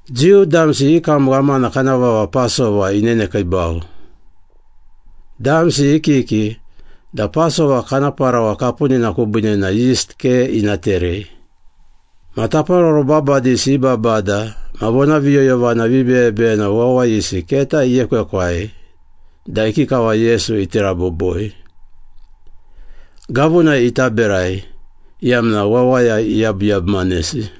Jiu damsi i kam ghamana kana vava Pasova inenekiibau. Damsi i kiki da Pasova kana parawa kapunina kubiine na yist ke ina terei. Ma taparoro babadisi i babada ma vonaviyoyovana vibeyebeyena wawayisi keta iekwekwai da ikikava Yesu iti raboboi. Gavunai ita berai, iyamna wawaya iyabuyabumanesi.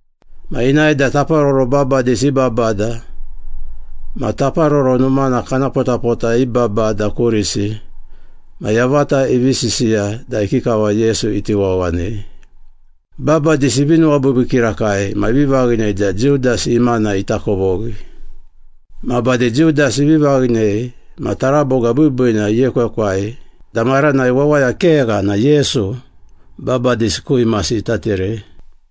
Ma inae da taparoro babadisi i babada ma Taparoro Numana kana potapota i babada kurisi ma yavata ivi sisiya da ikikava Yesu iti wawanei. Babadisi ivi nuwabiibii kirakai ma ivi vaghinei da Judas imana ita kovoghi. Ma bade Judas ivi vaghinei ma taraboga biibiina iekwekwai da maranai wawaya kegha na Yesu babadisi ku imasi ita terei.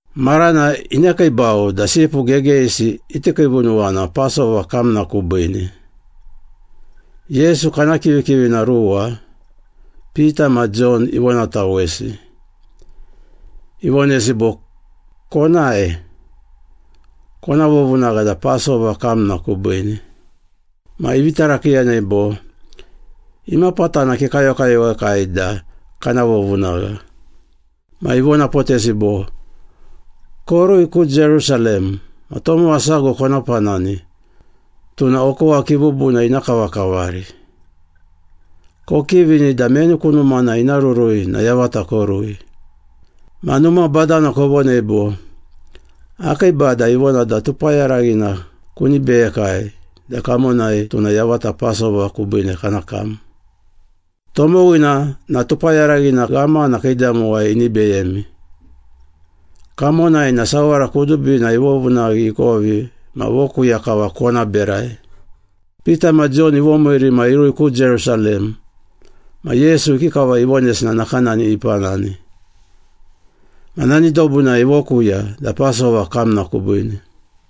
Marana inekiibau da sipu gegeyisi iti kiivunuwana Pasova kamna kubiine. Yesu kana kivikivina ruwa, Pita ma Jon ivonatawesi. Ivonesi bo, “Konae. Kona vovunagha da Pasova kamna kubiine.” Ma ivi tarakiiyanei bo, “Imapatana kekayokayowekai da kana vovunagha?” Ma ivonapotesi bo, “Korui ku Jerusalem ma tomowa sago kona panani, tuna okowa kibubuna ina kavakavari. Kokivini da meni ku numana ina rurui na yavata korui. Ma numa badana kovonei bo, ‘Akii Bada ivona da tupayaraghina kuni beyekai da kamonai tuna yavata Pasova kubiine kana kam.’ Tomowina na tupayaraghina ghamana kiidamowai ini beyemi. Kamonai na sawara kudubina ivovunaghi ikovi ma vokuya kava kona berai.” Pita ma Jon ivomiiri ma irui ku Jerusalem ma Yesu ikikava ivonesi na nakanani ipanani. Ma nani dobunai ivokuya da Pasova kamna kubiine.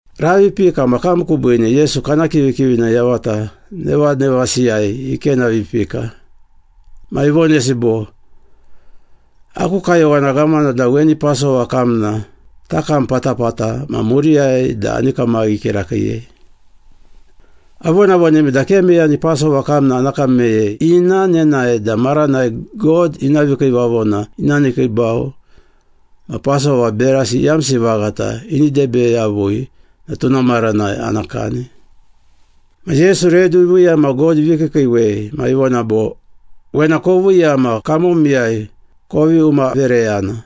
Ravi ipika ma kam kubiine Yesu kana kivikivina yavata nevanevasiyai ikenavipika. Ma ivonesi bo, “Aku kayowana ghamana da weni Pasova kamna takam patapata ma muriyai da ani kamaghi kirakiiyei. Avonavonemi da ke meyani Pasova kamna ana kam meyei ina nenae da maranai God ina vikiivavona ina nekiibau ma Pasova berasi iyamsi vaghata ini debe yavui na tuna maranai ana kani.” Ma Yesu redu iviiya ma God ivi kiikiiwei ma ivona bo, “Wena koviiya ma kamomiyai kovi umavereyana.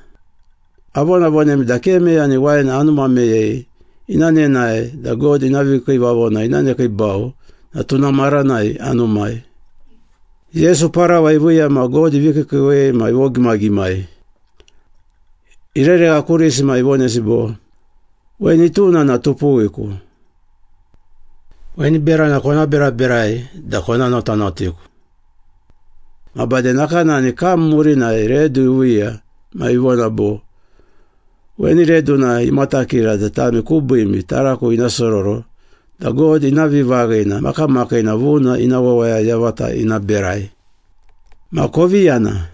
Avonavonemi da ke meyani wain anuma meyei ina nenae da God ina vikiivavona ina nekiibau na tuna maranai anumai.” Yesu parawa iviiya ma God ivi kiikiiwei ma ivogimagimai. Ireregha kurisi ma ivonesi bo, “Weni tuna na tupuwiku. Weni berana kona beraberai da kona notanotiku.” Ma bade nakanani kam murinai redu iviiya ma ivona bo, “Weni reduna imatakira da tami kubiimi taraku ina sororo da God ina vivaghina makamakiina vuna ina wawaya yavata ina berai.” “Ma kovi yana,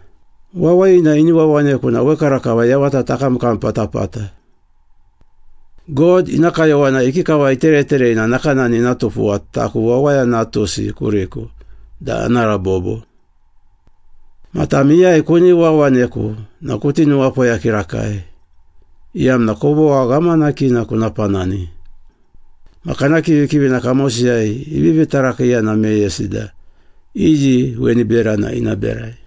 wawayina ini wawaneku na wekarakava yavata takamkam patapata. God ina kayowana ikikava itereterei na nakanani ina tupuwa taku, Wawaya Natusi kuriku da ana rabobo. Ma tam iyai kuni wawaneku na kuti nuwapoya kirakai, iyamna kovogha ghamanakina kuna panani.” Ma kana kivikivina kamosiyai ivivi tarakiiyana meyesi da iyi weni berana ina berai.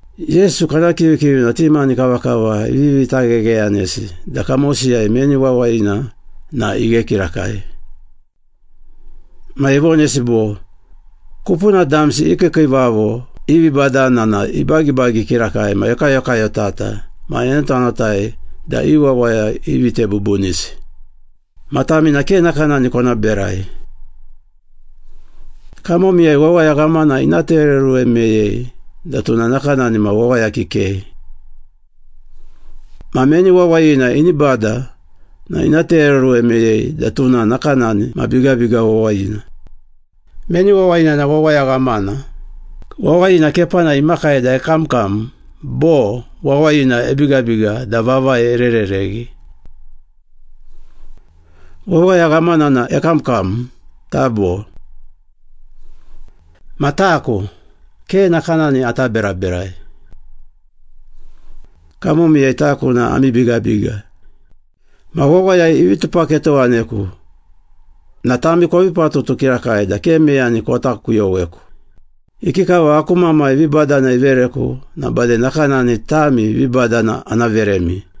Yesu kana kivikivina ti mani kavakava ivivi taghegheyanesi da kamosiyai meni wawayina na ghe kirakai. Ma ivonesi bo, “Kupuna damsi i kiikiivavo i vibadana na ibagibagi kirakai ma ekayokayotata ma enotanotai da i wawaya ivite bubunisi. Ma tami na ke nakanani kona berai. Kamomiyai wawaya ghamana ina tereoruwe meyei da tuna nakanani ma wawaya kikei. Ma meni wawayina ini bada na ina tereoruwe meyei da tuna nakanani ma bigabiga wawayina. Meni wawayina na wawaya ghamana, wawayina kepanai imakai da ekamkam bo wawayina ebigabiga da vavai ererereghi? Wawaya ghamana na ekamkam, tabo? Ma taku, ke nakanani ata beraberai. Kamomiyai taku na ami bigabiga.” “Ma wawaya ivi tupaketowaneku na tami kovi patutu kirakai da ke meyani kota kuyoweku. Ikikava aku Mamai vibadana ivereku na bade nakanani tami vibadana ana veremi.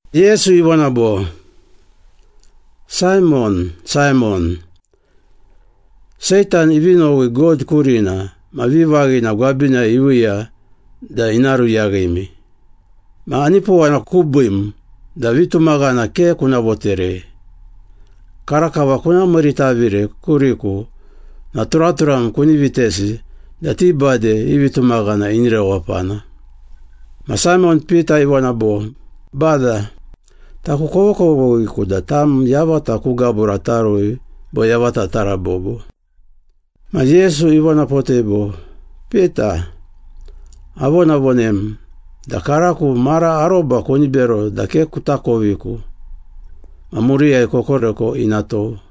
Yesu ivona bo, “Saimon, Saimon, Seitan ivi nowi God kurina ma vivaghina gwabinai iviiya da ina ruyaghimi. Ma anipowana kubiim da vitumaghana ke kuna voterei. Karakava kuna miiritavire kuriku na turaturam kuni vitesi da ti bade i vitumaghana ini rewapana.” Ma Saimon Pita ivona bo, “Bada, taku kovokovoghiku da tam yavata ku gabura tarui bo yavata tarabobo.” Ma Yesu ivonapotei bo, “Pita, avonavonem da karako mara aroba kuni bero da ke kutakoviku ma murinai kokoreko ina tou.”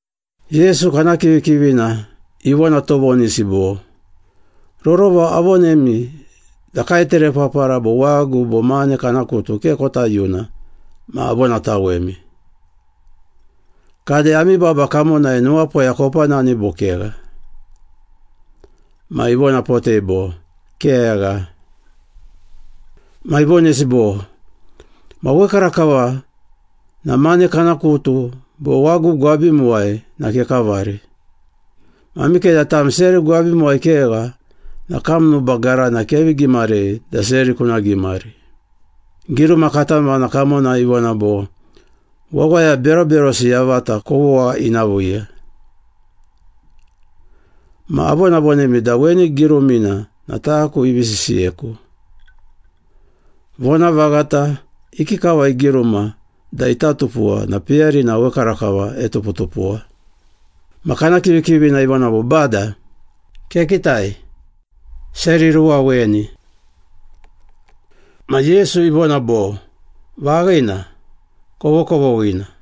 Yesu kana kivikivina ivona tovonisi bo, “Rorova avonemi da kaeterepapara bo wagu bo mane kana kutu ke kota yuna ma avonatawemi. Kade ami baba kamonai nuwapoya kopanani bo kegha?” Ma ivonapotei bo, “Kegha.” Ma ivonesi bo, “Ma wekarakava na mane kana kutu bo wagu gwabimuwai na kekavari. Ma mikeda tam seri gwabimuwai kegha na kam nuba garana kevi gimarei da seri kuna gimari. Giruma katamana kamonai ivona bo, ‘Wawaya beroberosi yavata kovogha ina viiya. Ma avonavonemi da weni girumina na taku ivi sisiyeku. Vonavaghata, ikikava igiruma da ita tupuwa na peyarina wekarakava etuputupuwa.’” Ma kana kivikivina ivona bo, “Bada, kekitai. Seri ruwa weni.” Ma Yesu ivona bo, “Vaghina, kovokovoghina.”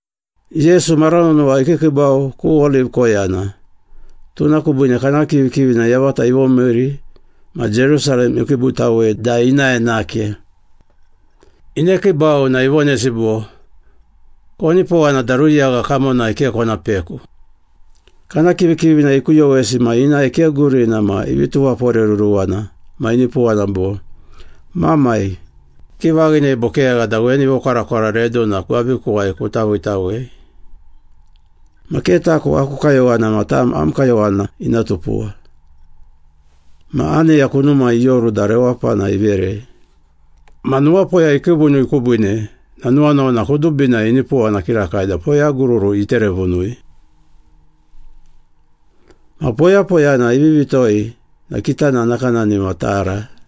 Yesu mara nonowa ikiikiibau ku Oliv koyana, tuna kubiine kana kivikivina yavata ivomiiri ma Jerusalem ikiibutawei da inae nake. Inekiibau na ivonesi bo, “Konipowana da ruyagha kamonai ke kona peku.” Kana kivikivina ikuyowesi ma inae ke gurina ma ivi tuwaporeruruwana ma inipowana bo, “Mamai, kivaghinei bo kegha da weni vokwarakwara reduna gwabikuwai kuta viitawei. Ma ke taku aku kayowana ma tam am kayowana ina tupuwa.” Ma aneya kunumai ioru da rewapana iverei. Ma nuwapoya ikiivunui kubiine na nuwanuwana kudubinai inipowana kirakai da poyagururu iterevunui. Ma poyapoyana ivivi toi na kitana nakanani ma tara.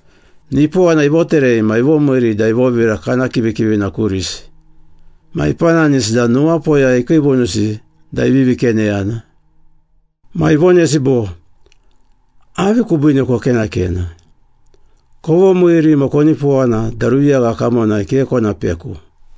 Nipowana ivoterei ma ivomiiri da ivovira kana kivikivina kurisi, ma ipananisi da nuwapoya ikiivunusi da ivivi keneyana. Ma ivonesi bo, “Avi kubiine kokenakena? Kovomiiri ma konipowana da ruyagha kamonai ke kona peku.”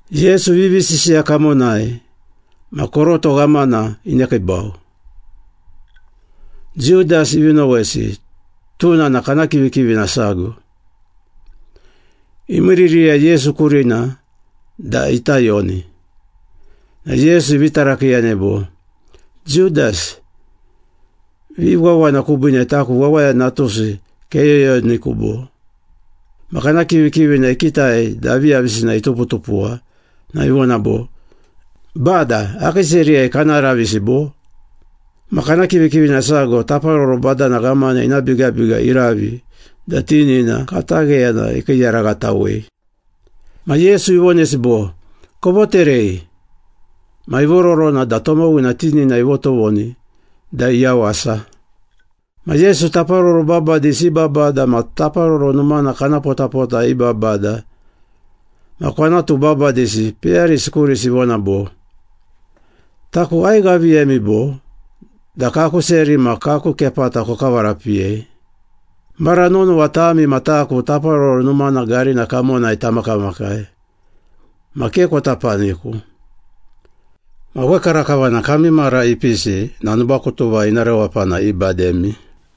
Yesu ivivi sisiya kamonai ma koroto ghamana inekiibau. Judas ivi nowesi, tuna na kana kivikivina sago. Imiiririya Yesu kurina da ita yoni, na Yesu ivi tarakiiyanei bo, “Judas, viwawana kubiine taku Wawaya Natusi keyoyoniku, bo?” Ma kana kivikivina ikitai da aviyavisina ituputupuwa na ivona bo, “Bada, akii seriyai kana ravisi, bo?” Ma kana kivikivina sago taparoro badana ghamana ina bigabiga iravi da tinina katagheyana ikiiyaraghatawei. Ma Yesu ivonesi bo, “Kovoterei!” Ma ivororona da tomowina tinina ivotovoni da iyawasa. Ma Yesu taparoro babadisi i babada ma Taparoro Numana kana potapota i babada ma kwanatu babadisi peyarisi kurisi ivona bo, “Taku aighaviyemi bo, da kaku seri ma kaku kepata kokavarapiyei? Mara nonowa tami ma taku Taparoro Numana garina kamonai tamakamakai, ma ke kota paniku. Ma wekarakava na kami mara ipisi na nubakutuva ina rewapana ibademi.”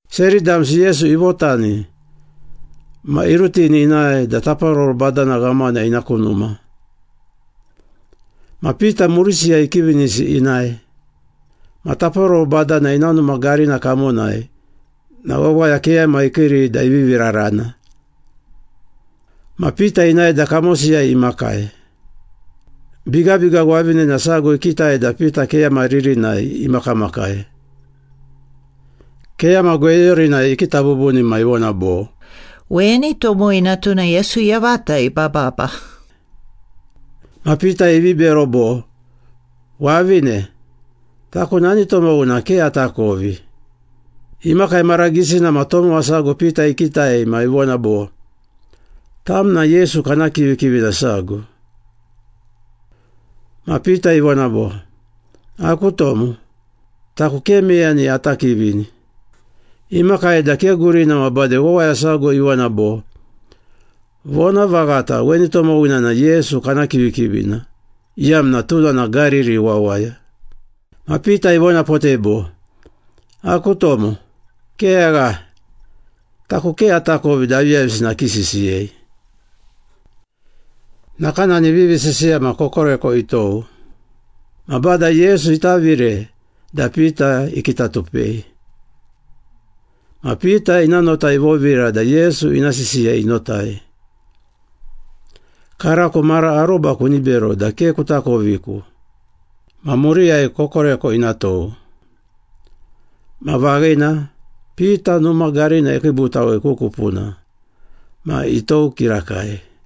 Seri damsi Yesu ivotani ma irutini inae da taparoro badana ghamana ina ku numa. Ma Pita murisiyai ikivinisi inae. Ma taparoro badana ina numa garina kamonai na wawaya keyama ikiiri da ivivi rarana. Ma Pita inae da kamosiyai imakai. Bigabiga wavinena sago ikitai da Pita keyama ririnai imakamakai. Keyama gweyorinai ikita bubuni ma ivona bo, “Weni tomowina tuna Yesu yavata ibababa.” Ma Pita ivi bero bo, “Wavine, taku nani tomowina ke atakovi!” Imakai mara gisina ma tomowa sago Pita ikitai ma ivona bo, “Tam na Yesu kana kivikivina sago.” Ma Pita ivona bo, “Aku tomo, taku ke meyani ata kivini.” Imakai da ke gurina ma bade wawaya sago ivona bo, “Vonavaghata, weni tomowina na Yesu kana kivikivina, iyamna tuna na Gariri wawaya.” Ma Pita ivonapotei bo, “Aku tomo, kegha. Taku ke atakovi da aviyavisina kisisiyei!” Nakanani ivivi sisiya ma kokoreko itou. Ma Bada Yesu itavire da Pita ikitatupei. Ma Pita ina nota ivovira da Yesu ina sisiya inotai. “Karako mara aroba kuni bero da ke kutakoviku ma muriyai kokoreko ina tou.” Ma vaghina, Pita numa garina ikiibutawei ku kupuna ma itou kirakai.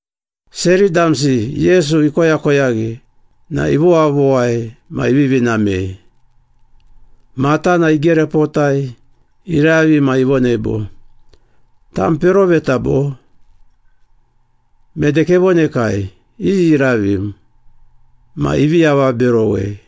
Seri damsi Yesu ikoyakoyaghi na ivowavowai ma ivivi namei. Matana igerepotai, iravi ma ivonei bo, “Tam peroveta bo? Mede kevonekai, iyi iravim?” Ma ivi avaberowei.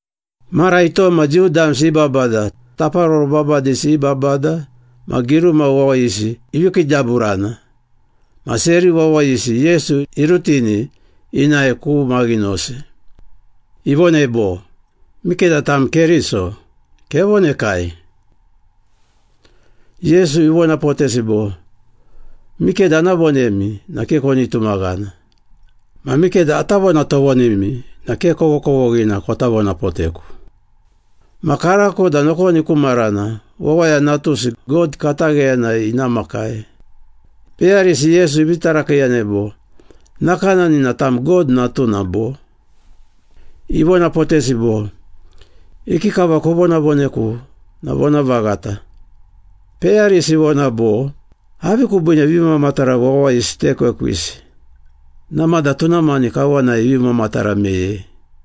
Mara itom ma Jiu damsi i babada, taparoro babadisi i babada, ma giruma wawayisi ivi kiidaburana ma seri wawayisi Yesu irutini inae ku maghinosi. Ivonei bo, “Mikeda tam Keriso, kevonekai.” Yesu ivonapotesi bo, “Mikeda ana vonemi na ke koni tumaghana. Ma mikeda ata vonatovonimi na ke kovokovoghina kota vonapoteku. Ma karako da nokoni ku marana, Wawaya Natusi, God katagheyanai ina makai.” Peyarisi Yesu ivi tarakiiyanei bo, “Nakanani na tam God natuna, bo?” Ivonapotesi bo, “Ikikava kovonavoneku na vonavaghata.” Peyarisi ivona bo, “Avi kubiine vimamatara wawayisi tekwekwisi? Namada tuna mani kawanai ivi mamatara meyei.”